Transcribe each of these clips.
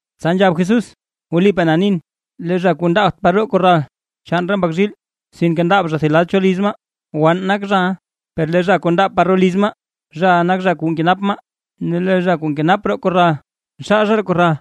Tsa nzhab Jesús: ―Wlipaa na nin, lee zha kuu ndaabt par roo korral chaan re mbak zhiil, sinke ndaab zha thib lad cho liz maa, wann nak zhaʼa. Per lee zha kuu ndaab par roo liz maa, zhaʼa nak zha kuu nkenap maa. Ne lee zha kuu nkenap roo korral, nxaal zha roo korral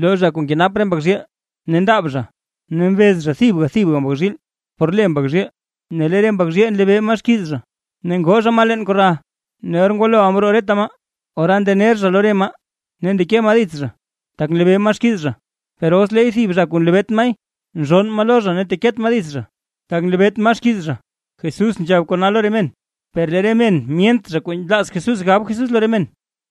lo zha kuu nkenap re mbak zhiil, ne ndaab zha ne mbez zha thib thib mbak zhiil por le mbak zhiil ne lee re mbak zhiil nlebee maa xkiiz zha. Ne ngoo zha maa leen korral. Ne or ngwaloʼa mroo reta maa, ora ndener zha lo re maa, ne ndeke maa dits zha tak nlebee maa xkiiz zha. Per os leey thib zha kuu nlebeet maay, nzhonn maa lo zha ne teket maa dits zha, tak nlebeet maa xkiiz zha. Jesús nzhab kona lo re men, per lee re men myent kuu nlaaz Jesús gab Jesús lo re men.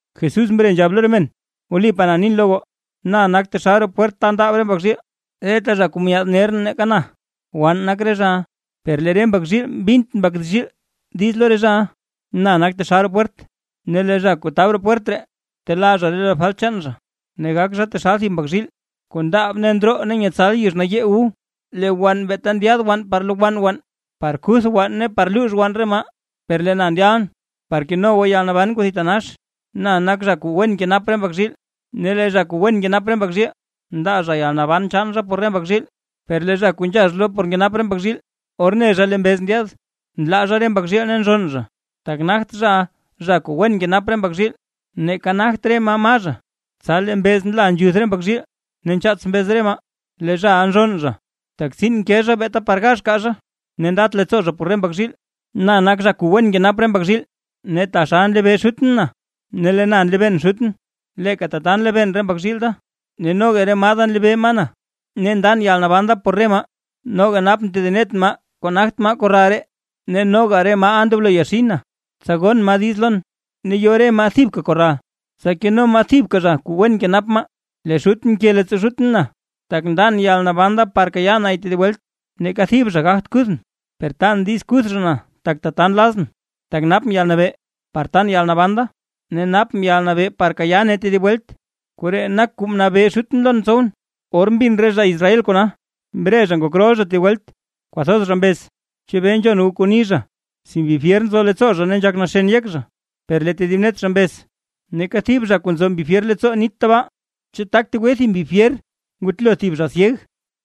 Jesús mre nzhab lo re men: ―Wlipaa na nin lo goo: Na nak taxal roo pwert ta ndaab re mbak zhiil. Reta zha kuu myaad ner nake na, wann nak re zhaʼa, per lee re mbak zhiil mbint mbak zhiil diiz lo re zhaʼa. Na nak taxal roo pwert, ne lee zha kuu tab roo pwert ree, telaa zha lo re falt chaan zha. Ne gak zha taxal thib mbak zhiil, kuu ndaab ne ndroo ne nyetsal yizh nayee wu. ’Lee wann beeta ndyaad wann par lowann wann, par kuth wann ne par luux wann re maa, per lee na ndyalʼn par keno goo yalnaban kuu thitanax. Na nak zha kuu wen nkenap re mbak zhiil. Ne lee zha kuu wen nkenap re mbak zhiil, ndaa zha yalnaban chaan zha por re mbak zhiil, per lee zha kuu nzhax lo por nkenap re mbak zhiil, or ne zha lee mbez ndyaad, nlaa zha re mbak zhiil ne nzhonn zha, tak nagt zhaʼa, zha kuu wen nkenap re mbak zhiil, neeka nagt re maa, maa zha. Tsa lee mbeez nla nzhuth re mbak zhiil, ne nchaats mbeez re maa. Lee zhaʼa nzhonn zha, tak tsiin nke zha beeta par gax kaa zha, ne ndat leettsoo zha por re mbak zhiil. ’Na nak zha kuu wen nkenap re mbak zhiil. Ne taxal nlebee Xutʼn na, ne lee na nlebeen Xutʼn, leeka tata nlebeen re mbak zhiil da, ne noga re maa da nlebee maa na. Ne ndan yalnaban da por re maa. Noga napʼn tedib net maa kuu nagt maa korral ree, ne noga re maaʼa ndoblo yaxin. Tsa gon maa diiz lon, ne yo re maa thibka korral, tsa keno maa thibka zha kuu wen kenap re maa. ’Lee Xutʼn nke leettsoo Xutʼn na, tak ndan yalnaban da, par kayaa nay tedib welt. Neeka thib zha gagt kuthʼn, per tan diiz kuth zha na tak tata nlazʼn. Tak napʼn yalnabee par tan yalnaban da, ne napʼn yalnabee par kayaa nay tedib welt. Koree nak kuu mnabee Xutʼn lon tsowʼn. Or mbin re zha Israel re kona, mre zha ngok rol zha tedib welt. Kwathoz zha mbez: ―¿Chebee nzhon goo kuu ni zha? Si mbi fyer nzo leettsoo zha ne nzhak naxen yek zha. Per lee tedib net zha mbez: ―Neeka thib zha kuu nzo mbi fyer leettsoo nit tabaa. ¿Chu, tak tegwe thib mbi fyer ngutlo thib zha syeg?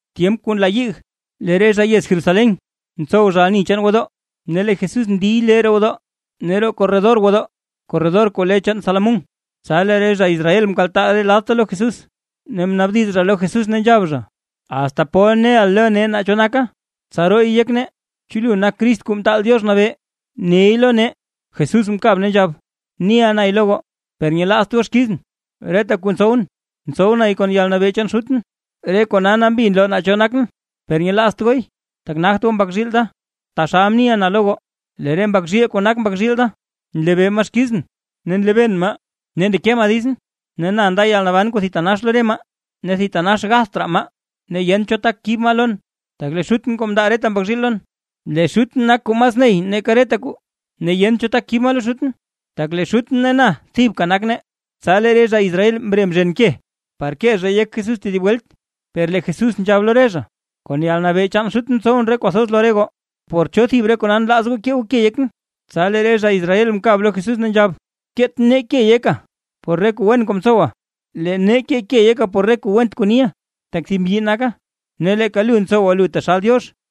Tyemp kuu nla yig, lee re zha yez Jerusalén ntsow zha ani chaan gwodoo zha. Ne lee Jesús ndiy lee roo gwodoo ne roo korredor gwodoo, korredor kuu le chaan Salomón. Tsa lee re zha Israel mkaltaa re ladta lo Jesús, ne mnaabdiz zha lo Jesús ne nzhab zha: ―¿Asta pol neʼa lo nee naa cho naka, tsa rooy yek nee? ¿Chu lu nak Crist Kuu Mtaal Diox Nabee? Neey lo nee. Jesús mkab ne nzhab: ―Niʼa nay lo goo, per nyelaazt goo xkizʼn. Reta kuu ntsowʼn, ntsow nay kon yalnabee chaan Xutʼn, re kona nambi nloo naa cho nakʼn, per nyelaazt gooy, tak nagt goo mbak zhiil da, taxal mniʼa na lo goo. Lee re mbak zhiil kuu nak mbak zhiil da, nlebee maa xkizʼn, ne nlebeen maa, ne ndeke maa ditsʼn. Ne na nda yalnaban kuu thitanax lo re maa, ne thitanax gatht raa maa, ne yent cho tak kib maa lon. Tak lee Xutʼn kuu mndaa reta mbak zhiil lon, lee Xutʼn nak kuu mas ney nake reta kwaa, ne yent cho tak kib maa lo Xutʼn. Tak lee Xutʼn ne na thibka nak nee. Tsa lee re zha Israel mre mzhen ke, par kee zhay yek Jesús tedib welt, per lee Jesús nzhab lo re zha: ―Kon yalnabee chaan Xutʼn mtsowʼn re kuu thoz lo re goo, ¿por cho thib re kona nlaaz goo kee goo ke yekʼn? Tsa lee re zha Israel mkab lo Jesús ne nzhab: ―Keet nee ke yeka por re kuu wen kuu mtsowa, lee nee keey yeka por kuu went kuu niʼa. Tak thib mbyi naka, ne leeka lu ntsowa lu taxal Diox.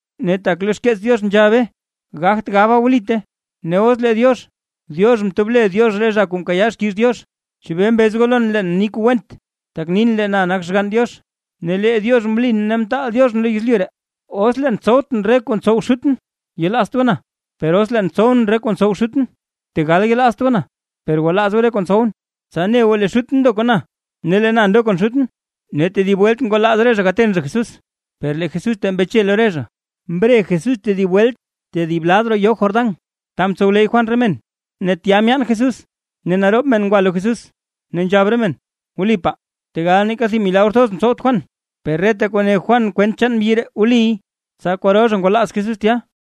Ne tak lo xkeets Diox nzhabe gagt gabaa wlite, ne os lee Diox, diox mtob le Diox re zha kuu mkayaa xkiiz Diox. ¿Chebee mbez goo lon leen mni kuu went, tak nin lee na nakʼn Xgann Diox? Ne lee Diox mlin ne mtaalʼn lo yezlyu ree. Os leen ntsowtʼn re kuu ntsow Xutʼn, yelaazt goo na. Per os leen ntsow re kuu ntsow Xutʼn, tegal yelaazt goo na, per gwalaaz goo re kuu ntsowʼn, tsa ne goo lee Xutʼn ndo kon na ne lee na ndon kon Xutʼn. Ne tedib welt ngwalaaz re zha gaten zha Jesús, per lee Jesús tee mbeche lo re zha. Mre Jesús tedib welt tedib lad roo yoo Jordán, ta mtsowleyy Juan re men, ne tya myaan Jesús. Ne naroob men ngwa lo Jesús, ne nzhab re men: ―Wlipaa, tegal neeka thib milagr thoz mtsowt Juan, per reta kuu ne Juan kwent chaan mbyi ree wliy. Tsa kwaro zha ngwalaaz Jesús tya.